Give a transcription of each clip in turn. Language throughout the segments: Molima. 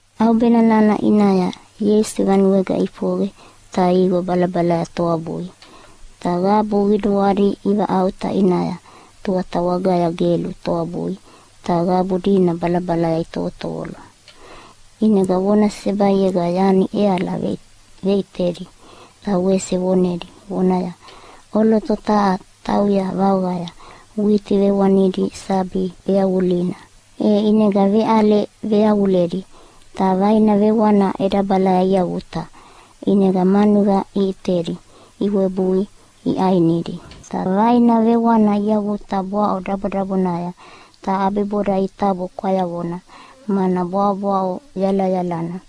ʼAubena nana ʼinaya Ieisu vanuega ʼifoqe ta iqo balabalaya toabui. Ta qabu qiduadi ivaʼauta ʼinaya tuata wagaya gelu toabui ta qabu dina balabalaya itovotovolo. ʼInega vona sesebaiega yani ʼeala veʼitedi, ta wese vonedi vonaya, “ʼOloto taha tauya vaoqaya witi vewanidi sabi veyavulina. E ʼinega veʼale veyavuledi, ta vaina vewana ʼedabalaya iavuta ʼinega manuqa iʼitedi iwebui iʼainidi. Ta vaina vewana iavuta bwaʼo dabodabonaya, ta ʼabiboda itabo kwayavona, mana bwaʼobwaʼo yalayalana.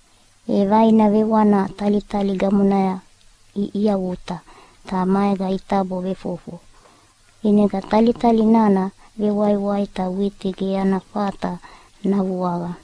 E vaina vewana talitali gamonaya iavuta ta maega itabo vefofo, ʼinega talitali nana vewaiwai ta witi ge ana fata navuaqa.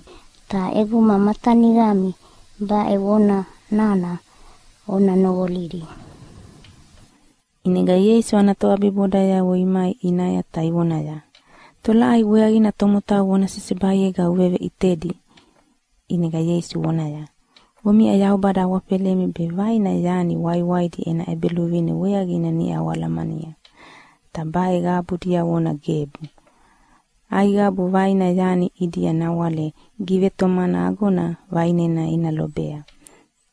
Ta ʼeguma ma taniqami baʼe vona nana ona noqolidi.” ʼInega Ieisu ana toʼabibodayavo imai ʼinaya ta ivoneaya, “Tolaʼai weaqina tomotau vona sesebaiega uveveʼitedi?” ʼInega Ieisu vonaya, “Omiʼa Yaubada awafelemi be vaina yani ʼwaiʼwaividi ena ʼEbeluvine weaqina niʼa oalahalamania, ta baʼe qabu diavona gebu. Aiqabu vaina yani ʼidia nawale givetomana ago vaʼinena ina lobea,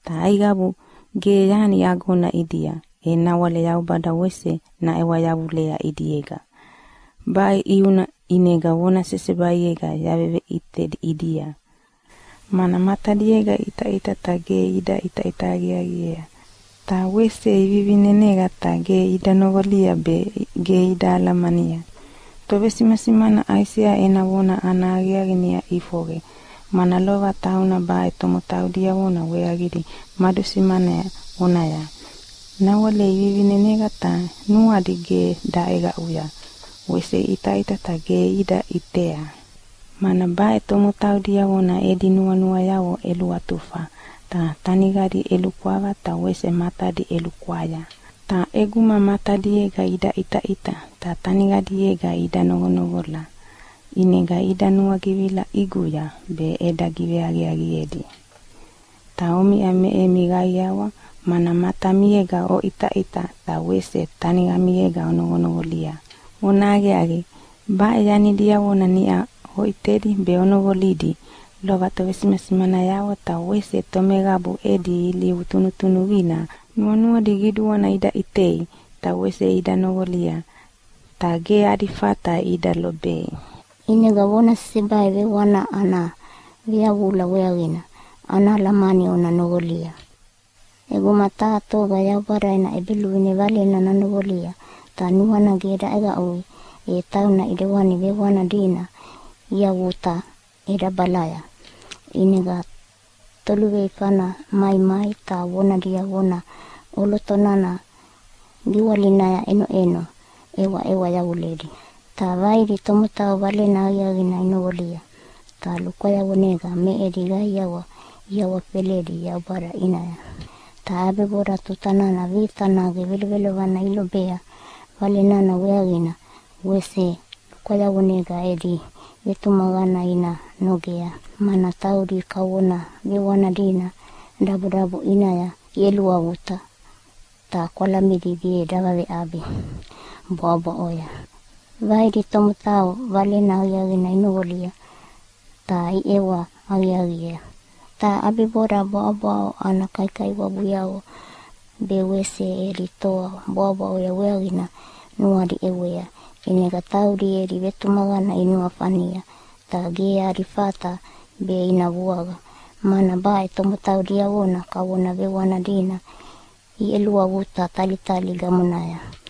ta aiqabu ge yani agona ʼidia, e nawale Yaubada wese naʼewa yavulea ʼidiega. Baʼe ʼiuna ʼinega vona sesebaiega yaveveʼita ʼidia, mana matadiega iʼitaʼita ta ge ida ʼita aqiaqiea. Ta wese ivivineneqa ta ge ida noqoli be ge ida alamania. “Tovesimasimana Aisea ena vona ana aqiaqi niʼa ʼifoqe, mana lova tauna baʼe tomotau diavona weaqidi madusimanea vonaya, ‘Nawale ivivineneqa ta nuadi ge daʼeqaʼui, wese iʼitaʼita ta ge ida ʼitei. Mana baʼe tomotau diavona edi nuanuayavo ʼeluatufa, ta teniqadi ʼelukwava ta wese matadi ʼelukwaya. Ta ʼeguma matadiega ida ʼitaʼita ta teniqadiega ida noqonoqola ʼinega ida nuagivila ʼiguya be eda giveaqiaqiedi.’ Ta omiʼa me emi qaiawa, mana matamiega oʼitaʼita ta wese teniqamiega onoqonoqolia. Vonahaqiaqi, baʼe yani diavona niʼa oʼitedi be onoqolidi lova tovesimasimanayavo ta wese tomeqabu edi ilivu tunutunuqina nuanuadi qiduana ida ʼitei ta wese ida noqolia, ta ge adi fata ida lobei. “ʼInega vona sesebai vewana ana veyavula weaqina ana alamani ona noqolia. ʼEguma taha toga Yaubada ena ʼEbeluvine valena nanoqolia ta nuana ge daʼeqaʼui, e tauna ʼidewani vewana dina iavuta ʼedabalaya, ʼinega toluveifana maimai ta vona diavona ʼoloto nana giwalinaya ʼenoʼeno ʼewaʼewa yavuledi. Ta vaidi tomotau Valena Aqiaqina inoqolia ta lukwayavonega me edi qaiawa iawafeledi Yaubada ʼinaya. Ta ʼabiboda tuta nana vita nage vevoalana ilobea Vale nana weaqina wese lukwayavonega edi vetumaqana ina nogea, mana taudi kavona vewana dina dabodabo ʼinaya iʼeluavuta ta kwalamidi ge davaveʼabi bwaʼobwaʼoya. Vaidi tomotau Valena Aqiaqina inoqolia ta iʼewa aqiaqiea, ta ʼabiboda bwaʼobwaʼo ana kaikaiwabuyavo be wese edi toa bwaʼobwaʼoya weaqina nuadi ʼewea, ʼinega taudi edi vetumaqana inuafania ta ge adi fata be ina vuaqa, mana baʼe tomotau diavona kavona vewana dina iʼeluavuta talitali gamonaya.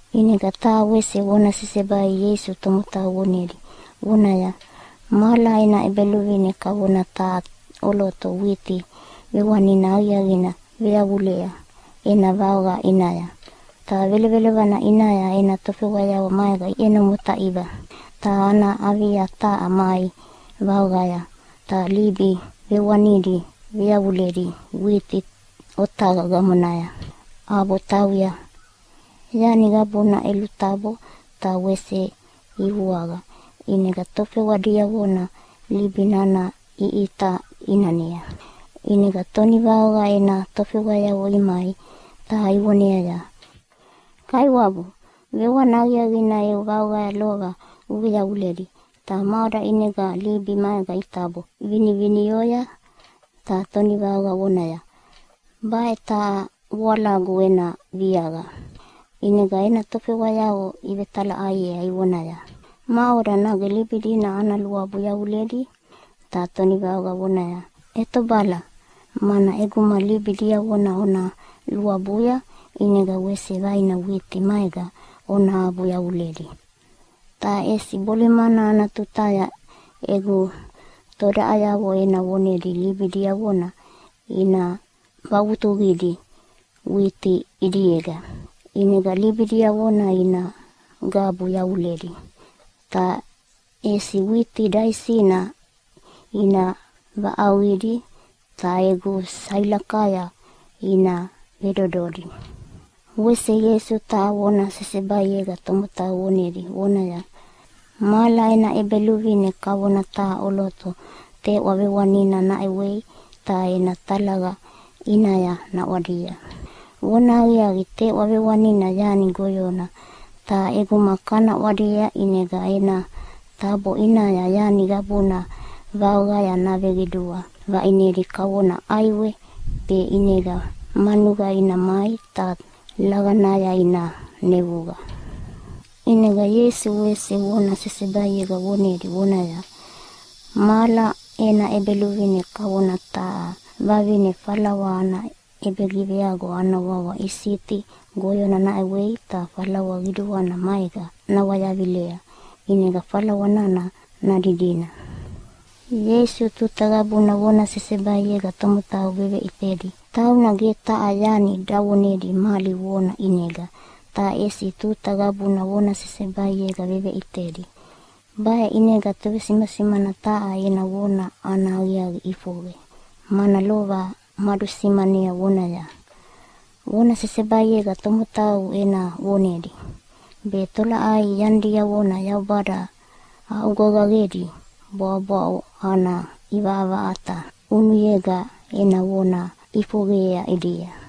ʼInega taha wese vona sesebai Ieisu tomotau vonedi vonaya, “Mahala ena ʼEbeluvine kavona taha ʼoloto witi vewanina aqiaqina veyavulea ena vaoqa ʼinaya. Ta velovelovana ʼinaya ena tofewayavo maega iʼeno motaiva ta ana avia taha mai vaoqaya ta libi vewanidi veyavuledi witi otaqa gamonaya, ʼabo tauya. Yani qabuna ʼelutabo ta wese ivuaqa, ʼinega tofewa diavona libi nana iʼita ʼinanea. “ʼInega tonivaoqa ena tofewayavo imai ta ivoneaya, ‘Kaiwabu, vewana aqiaqina eu vaoqaya lova uveyavuledi, ta maʼoda ʼinega libi maega itabo vinivinioya?’ Ta tonivaoqa vonaya, ‘Baʼe taha voalagu ena viaqa.’ ʼInega ena tofewayavo ivetelaʼaiea ivonaya, ‘Maʼoda, nage libi dina ana luabu yavuledi?’ Ta tonivaoqa vonaya, ‘ʼEtobala, mana ʼeguma libi diavona ona luabuya ʼinega wese vaina witi maega ona abu yavuledi. Ta ʼesi bolimana ana tutaya egu todaʼayavo ena vonedi libi diavona ina vavutuqidi witi ʼidiega, ʼinega libi diavona ina gabu yavuledi, ta ʼesi witi daisina ina vaʼauqidi ta egu sailakaya ina vedododi.’” Wese Ieisu taha vona sesebaiega tomotau vonedi vonaya, “Mahala ena ʼEbeluvine kavona taha ʼoloto teʼwa vewanina naʼewei ta ena talaqa ʼinaya naʼwadia. Vonahaqiaqi, teʼwa vewanina yani goyona, ta ʼeguma kana ʼwadia ʼinega ena tabo ʼinaya yani qabuna vaoqaya naveqidua vaʼinedi kavona ʼaiwe be ʼinega manuqa ina mai ta laqanaya ina nevuqa.” ʼInega Ieisu wese vona sesebaiega vonedi vonaya, “Mahala ena ʼEbeluvine kavona taha vavine falawa ana ʼebegiveago ana wawa isiti goyona naʼewei ta falawa qiduana maega nawayavilea, ʼinega falawa nana nadidina.” Ieisu tuta qabuna vona sesebaiega tomotau veveʼitedi. Tauna ge taha yani davonedi mali vona ʼinega, ta ʼesi tuta qabuna vona sesebaiega veveʼitedi. Baʼe ʼinega tovesimasimana taha ena vona ana aqiaqi ʼifoqe, mana lova madusimanea vonaya, “Vona sesebaiega tomotau ena vonedi, be tolaʼai yanidiavo Yaubada aʼugovaqedi bwaʼobwaʼo ana ʼivaʼavaʼata ʼunuyega ena vona ʼifoqeyea ʼidia.”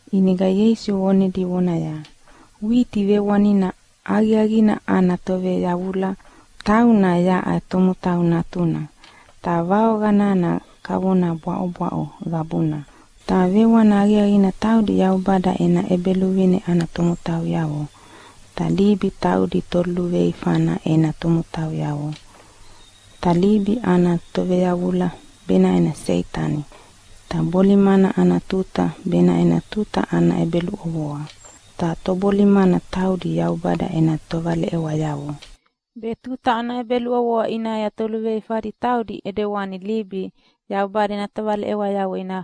ʼInega Ieisu vonedi vonaya, “Witi vewanina aqiaqina ana toveyavula, tauna yaʼa Tomotau Natuna. Ta vaoqa nana kavona bwaʼobwaʼo qabuna, ta vewana aqiaqina taudi Yaubada ena ʼEbeluvine ana tomotauyavo, ta libi taudi toluveifana ena tomotauyavo. Ta libi ana toveyavula benaʼe Seitani. Ta bolimana ana tuta benaʼe tuta ana ʼebeluʼovoa, ta tobolimana taudi Yaubada ena tovaleʼewayavo. Be tuta ana ʼebeluʼovoa ʼinaya toluveifadi taudi ʼidewani libi Yaubada ena tovaleʼewayavo ina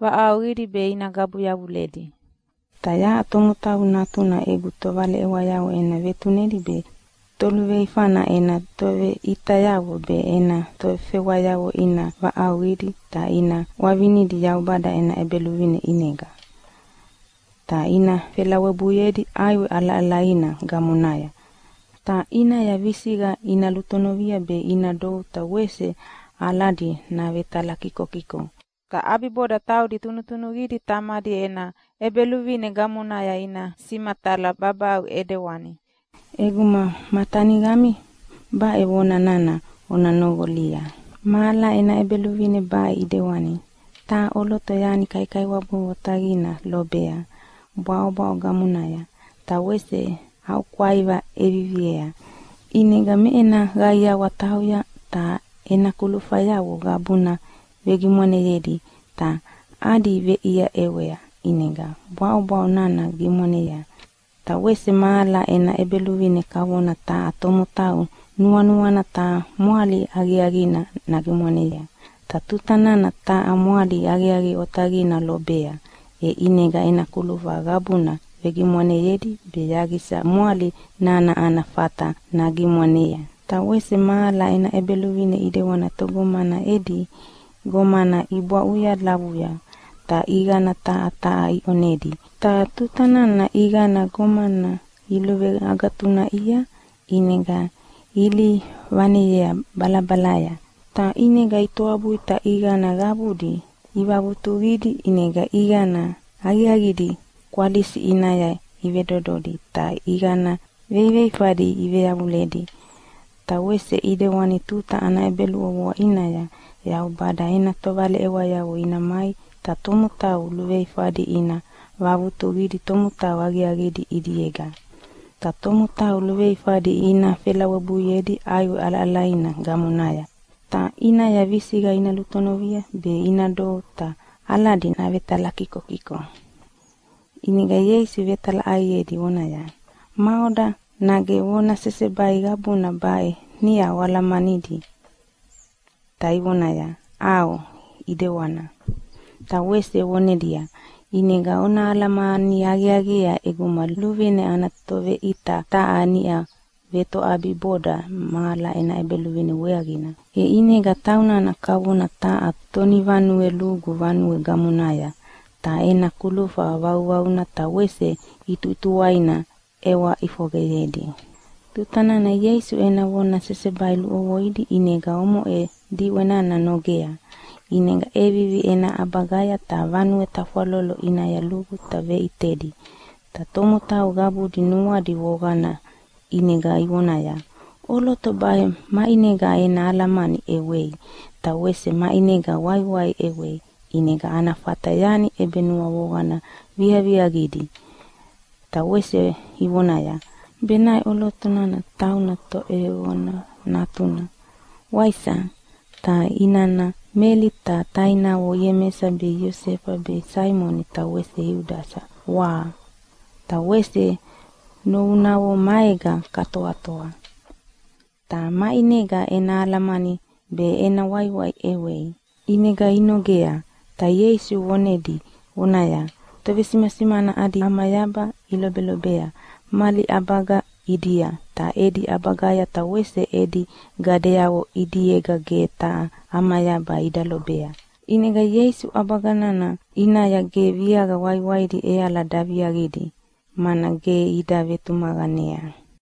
vaʼauqidi be ina gabu yavuledi. “Ta yaʼa Tomotau Natuna egu tovaleʼewayavo ena vetunedi be toluveifana ena toveʼitayavo be ena tofewayavo ina vaʼauqidi ta ina ʼwavinidi Yaubada ena ʼEbeluvine ʼinega. Ta ina felawebuiedi ʼaiwe ʼalaʼalaina gamonaya, ta ʼinaya visiqa ina lutonovi be ina dou ta wese aladi navetalakikokiko. Ta ʼabiboda taudi tunutunuqidi Tamadi ena ʼEbeluvine gamonaya ina simatala babaʼau ʼidewana. ʼEguma ma taniqami baʼe vona nana ona noqolia. “Mahala ena ʼEbeluvine baʼe ʼidewani. Taha ʼoloto yani kaikaiwabu otaqina lobea bwaʼobwaʼo gamonaya, ta wese aʼukwaiva ʼeviviea. ʼInega me ena qaiawa tauya ta ena kulufayavo qabuna vegimwaneyedi ta adi veʼia ʼewea, ʼinega bwaʼobwaʼo nana gimwanea. “Ta wese mahala ena ʼEbeluvine kavona taha tomotau nuanuana taha mwali aqiaqina nagimwanea. Ta tuta nana taha mwali aqiaqi otaqina lobea, e ʼinega ena kulufa qabuna vegimwaneyedi be yaqisa mwali nana ana fata nagimwanea. “Ta wese mahala ena ʼEbeluvine ʼidewani togomana edi gomana ibwaʼuya lavuya, ta ʼiqana taha taha iʼonedi. Ta tuta nana ʼiqana gomana iluveagatunaʼia ʼinega ilihi vaneyea balabalaya, ta ʼinega itoabui ta ʼiqana qabudi ivavutuqidi. ʼInega ʼiqana aqiaqidi kwalisi ʼinaya ivedododi ta ʼiqana veiveifadi iveyavuledi. Ta wese ʼidewani tuta ana ʼebeluʼovoa ʼinaya Yaubada ena tovaleʼewayavo ina mai ta tomotau luveifadi ina vavutuqidi tomotau aqiaqidi ʼidiega. Ta tomotau luveifadi ina felawebuiedi ʼaiwe ʼalaʼalaina gamonaya, ta ʼinaya visiqa ina lutonovi be ina dou ta aladi navetalakikokiko.” ʼInega Ieisu vetalaʼaiedi vonaya, “Maʼoda, nage vona sesebai qabuna baʼe niʼa oalamanidi?”, ta ivonaya, “ʼAo, ʼedewana.” Ta wese vonedia, “ʼInega ona alamani aqiaqiea ʼeguma luvine ana toveʼita taha niʼa vetoʼabiboda mahala ena ʼEbeluvine weaqina, e ʼinega taunana kavona taha tonivanue lugu vanue gamonaya ta ena kulufa vauvauna ta wese ʼituʼituwaina ʼewa ʼifoqeyedi.” Tuta nana Ieisu ena vona sesebai luʼovoidi ʼinega omoʼe diʼwe nana nogea. ʼInega ʼevivi ena ʼabagaya ta vanue tafwalolo ʼinaya lugu ta veʼitedi. Ta tomotau qabudi nuadi voqana ʼinega ivonaya, “ʼOloto baʼe maʼinega ena alamani ʼewei, ta wese maʼinega waiwai ʼewea ʼinega ana fata yani ʼebenuavoqana viaviaqidi?” Ta wese ivonaya, “Benaʼe ʼoloto nana tauna toʼeyoqona natuna, waisa? Ta inana Meli ta tainavo Iemesa be Iosefa be Saimoni ta wese Iudasa, wa? Ta wese novunavo maega katoatoa. Ta maʼinega ena alamani be ena waiwai ʼewei?” ʼInega inogea, ta Ieisu vonedi vonaya, “Tovesimasimana adi ʼamayaba ilobelobea mali ʼabaga ʼidia, ta edi ʼabagaya ta wese edi gadeavo ʼidiega ge taha ʼamayaba ida lobei.” ʼInega Ieisu ʼabaga nana ʼinaya ge viaqa waiwaidi ʼeala daviaqidi, mana ge ida vetumaqanea.